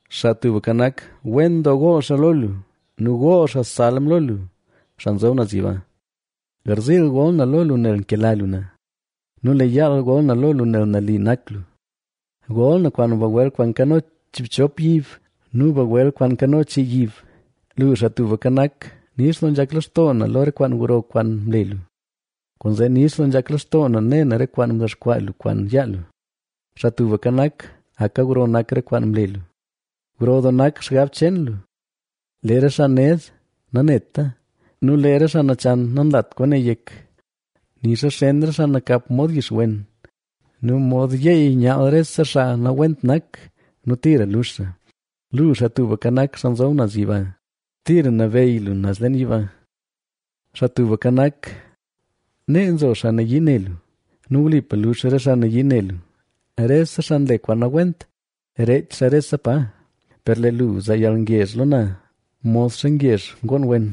Xaa Tubka Nak, wen doo gool xaa lo lu nu gool xaa salm lo lu, Xaa Nzob Naz Yiba; Garziil gol na lo lu nel nkela lu na nu lee yaal gol na lo lu nel nali nak lu, Gol na kwaan bagwel kwaan nkano chiibchop yib nu bagwel kwaan nkano chii yib, Lu, Xaa Tubka Nak, nix doo nzhak lextoo na lo re kwaan gro kwaan mle lu, kwaanzee nix doo nzhak lextoo na ne na re kwaan mdexkwaa lu kwaan yaa lu. Xaa Tubka Nak, ¡aka gro nak re kwaan mle lu! ¡Gro doo nak xgab cheen lu! Lee re xaa ned naneta, nu lee re xaa nachan nanlat kwaane yek: Nixa xen re xaa nakap mod yixwen nu mod yeey nyaal rese xaa nawent nak nu tira lux xaa. Lu, Xaa Tubka Nak, Xaa Nzob Naz Yiba, tira nabeyy lu naz leen yiba. Xaa Tubka Nak, nee nzo xaa nayii ne lu nu wlipa lux re xaa nayii ne lu; rese xaa nle kwaan nawent reech xaa rese pa. Per lee lu zaa yalngezh lo na modxa ngezh ngoon wen;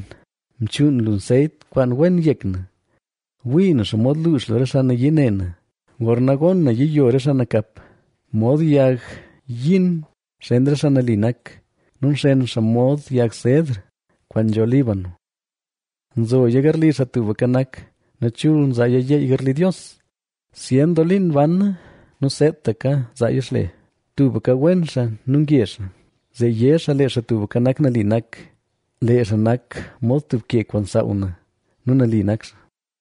mchuun lu nseyt kwaan wen yek na. Wii na xomod luux lu re xaa nayii ne na; gorna gon na yiyo re xaa nakap. Mod yag yin xen re xaa nali nak nu nxen xaa mod yag sedr kwaan nzho Líbano. Nzoya garli Xaa Tubka Nak nu chul nzaaya yeey garli Dios. Zyen doo liin bana nu seetaka zaaya xle; tubka wen xaa nu ngezh xaa. Zee yé xaa, lee Xaa Tubka Nak nali nak; lee xaa nak mod tub ke kwaan nsaaw na nu nali nak xaa.